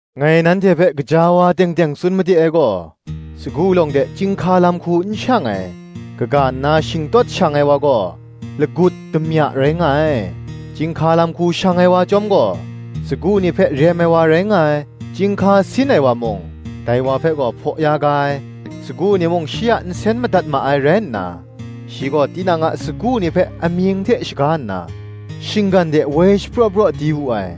Ngai nanhte hpe gaja wa teng teng tsun made ai gaw, Sagu lawng de chyinghka lam hku n shang ai, kaga kaw nna shingtawt shang ai wa gaw, lagut, damya rai nga ai. Chyinghka lam hku shang ai wa chyawm gaw, sagu ni hpe rem ai wa rai nga ai. Chyinghka sin ai wa mung, dai wa hpe gaw hpaw ya ga ai; sagu ni mung shi a nsen madat ma ai rai nna, shi gaw tinang a sagu ni hpe amying hte shaga nna, shinggan de woi shapraw praw di wu ai.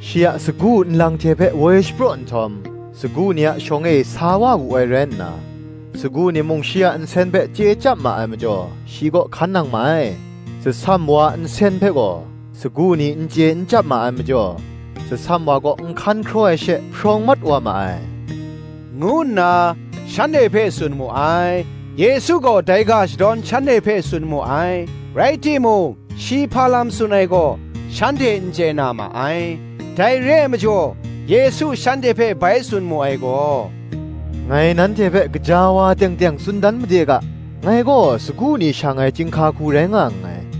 Shi a sagu nlang hte hpe woi shapraw nhtawm, sagu ni a shawng e sa wa wu ai rai nna, sagu ni mung shi a nsen hpe chye chyap ma ai majaw, shi kaw hkan nang ma ai. Tsasam wa a nsen hpe gaw, sagu ni n chye n chyap ma ai majaw, tsasam wa kaw n hkan hkraw ai she, hprawng mat wa ma ai,” ngu nna, shanhte hpe tsun mu ai. Yesu gaw dai ga shadawn shanhte hpe tsun mu ai; rai timung shi hpa lam tsun ai gaw, shanhte n chye na ma ai. Dai re ai majaw Yesu shanhte hpe bai tsun mu ai gaw, “Ngai nanhte hpe gaja wa teng teng tsun dan made ga, Ngai gaw sagu ni shang ai chyinghka hku rai nga nngai.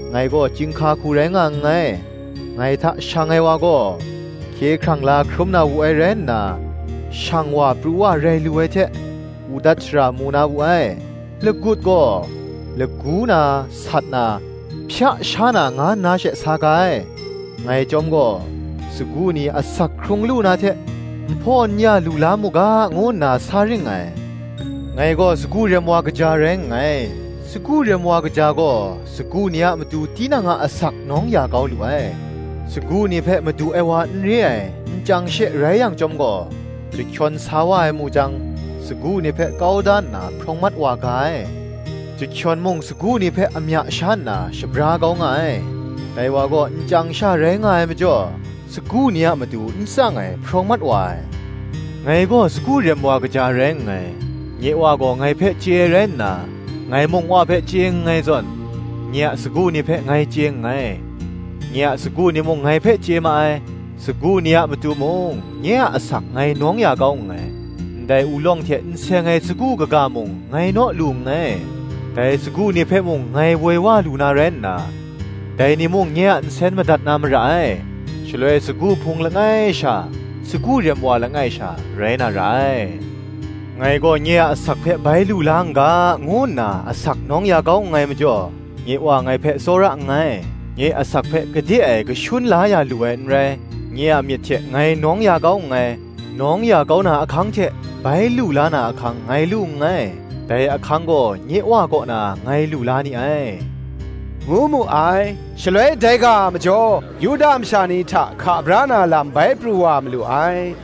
Ngai gaw chyinghka hku rai nga nngai: ngai hta shang ai wa gaw, hkye hkrang la hkrum na wu ai rai nna, shang wa pru wa rai lu ai hte, udat shara mu na wu ai. Lagut gaw, lagu na, sat na, hpya sha na nga nna she sa ga ai: ngai chyawm gaw, sagu ni asak hkrung lu na hte nhpaw n-ya lu la mu ga, ngu nna, sa ring ngai. Ngai gaw sagu rem wa kaja rai nngai: sagu rem wa kaja gaw, sagu ni a matu tinang a asak nawng ya kau lu ai. Sagu ni hpe madu ai wa n re ai, nchyang she rai yang chyawm gaw, chyahkyawn sa wa ai mu jang, sagu ni hpe kau da nna hprawng mat wa ga ai; chyahkyawn mung sagu ni hpe amya sha nna shabra kau nga ai: dai wa gaw nchyang sha rai nga ai majaw, sagu ni a matu n tsang ai hprawng mat wa ai. Ngai gaw sagu rem wa kaja rai nngai: nye Wa gaw ngai hpe chye ai rai nna, ngai mung Wa hpe chye nngai zawn, nye a sagu ni hpe ngai chye nngai, nye a sagu ni mung ngai hpe chye ma ai: sagu ni a matu mung, nye a asak ngai nawng ya kau nngai: Ndai ulawng hte n seng ai sagu kaga mung ngai naw lu nngai: dai sagu ni hpe mung ngai woi wa lu na rai nna, dai ni mung nye a nsen madat na mara ai; shaloi sagu hpung langai sha, sagu rem wa langai sha, rai na ra ai. Ngai gaw nye a asak hpe bai lu la n ga, ngu nna asak nawng ya kau nngai majaw, nye Wa ngai hpe tsawra nngai. Nye asak hpe gade e kashun la ya lu ai n rai: nye a myit hte ngai nawng ya kau nngai: nawng ya kau na ahkang hte bai lu la na ahkang ngai lu nngai: dai ahkang gaw nye Wa kaw na ngai lu la ni ai,” ngu mu ai. Shaloi dai ga a majaw, Yuda masha ni hta hka bra na lam bai pru wa malu ai.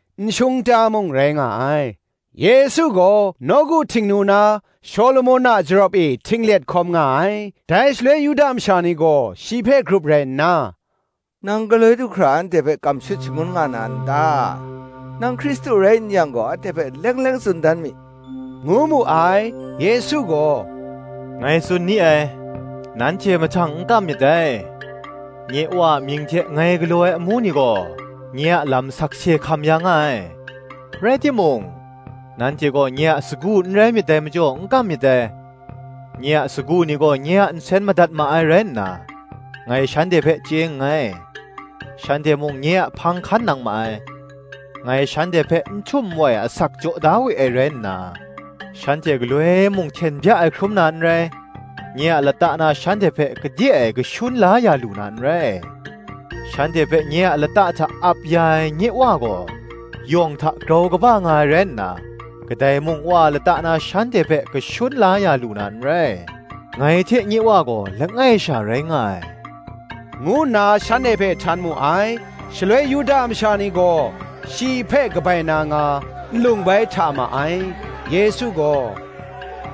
nshung ta mung rai nga ai; Yesu gaw nawku Htingnu na Shawlumon a jarawp e htinglet hkawm nga ai. Dai shaloi Yuda masha ni gaw shi hpe grup rai nna, “Nang galoi du hkra anhte hpe kam shut shangun nga na n ta? Nang Hkristu rai n yang gaw anhte hpe leng leng tsun dan mi,” ngu mu ai. Yesu gaw, Ngai tsun ni ai, nanhte mahtang n kam myit dai; nye Wa a mying hte ngai galaw ai amu ni gaw, nye a lam sakse hkam ya nga ai. Rai timung, nanhte gaw nye a sagu n rai myit dai majaw n kam myit dai. Nye a sagu ni gaw, nye a nsen madat ma ai rai nna, ngai shanhte hpe chye nngai, shanhte mung nye a hpang hkan nang ma ai: ngai shanhte hpe n htum n wai asak jaw da we ai rai nna, shanhte galoi mung hten bya ai hkrum na n rai; nye a lata na shanhte hpe gade e kashun la ya lu na n rai. Shanhte hpe nye a lata hta ap ya ai, nye Wa gaw, yawng hta grau kaba nga ai rai nna, kadai mung Wa a lata na shanhte hpe kashun la ya lu na n rai. Ngai hte nye Wa gaw langai sha rai nga ai,” ngu nna shanhte hpe htan mu ai. Shaloi Yuda masha ni gaw, shi hpe kabai na nga, nlung bai hta ma ai. Yesu gaw,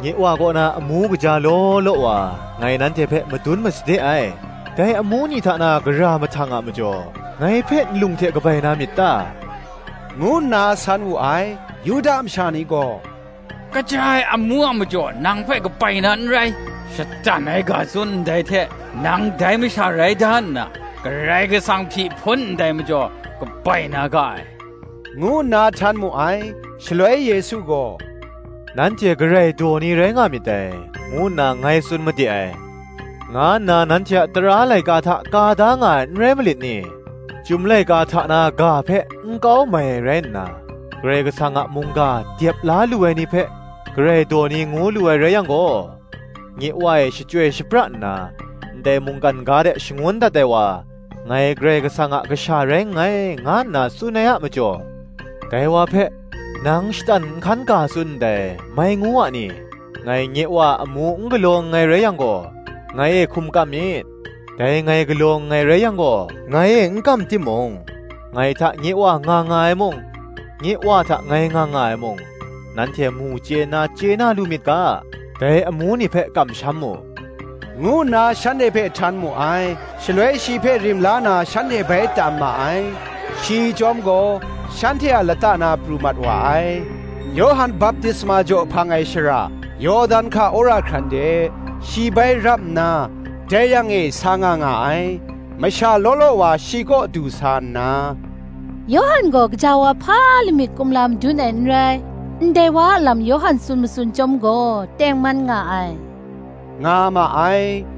“Nye Wa kaw na amu kaja law law wa ngai nanhte hpe madun masade ai: dai amu ni hta na gara mahtang a majaw, ngai hpe nlung hte kabai na myit ta?” ngu nna san wu ai. Yuda masha ni gaw, “Kaja ai amu a majaw nang hpe kabai na n rai, shatan ai ga tsun ndai hte, nang dai masha rai da nna, Karai Kasang hpyi hpun ndai majaw kabai na ga ai,” ngu nna htan mu ai. Shaloi Yesu gaw, “Nanhte Karai daw ni rai nga myit dai,” ngu nna ngai tsun made ai, nga nna nanhte a tara laika hta ka da nga ai n rai malit ni? Chyum laika hta na ga hpe n kau mai ai rai nna, Karai Kasang a mungga dep la lu ai ni hpe, Karai daw ni ngu lu ai rai yang gaw, nye Wa e shachyoi shapra nna, ndai mungkan ga de shangun dat ai wa, Ngai Karai Kasang a Kasha rai nngai, nga nna tsun ai a majaw, dai wa hpe, Nang shatan nhkan ga tsun ndai, mai ngu a ni? Ngai nye Wa a amu n galaw nngai rai yang gaw, ngai e hkum kam myit. Dai ngai galaw nngai rai yang gaw, ngai e n kam timung, ngai hta nye Wa nga nga ai mung, nye Wa hta ngai nga nga ai mung, nanhte mu chye nna chye na lu myit ga, dai amu ni hpe kamsham mu,” ngu nna shanhte hpe htan mu ai. Shaloi shi hpe rim la na shanhte bai tam ma ai: shi chyawm gaw shanhte a lata na pru mat wa ai. Yawhan baptisma jaw hpang ai shara, Yawdan hka wora hkran de, shi bai rap nna dai yang e sa nga nga ai. Masha law law wa shi kaw du sa nna, “Yawhan gaw gaja wa hpa lamik kumla madun ai n rai: ndai wa a lam Yawhan tsun matsun chyawm gaw tengman nga ai,” nga ma ai.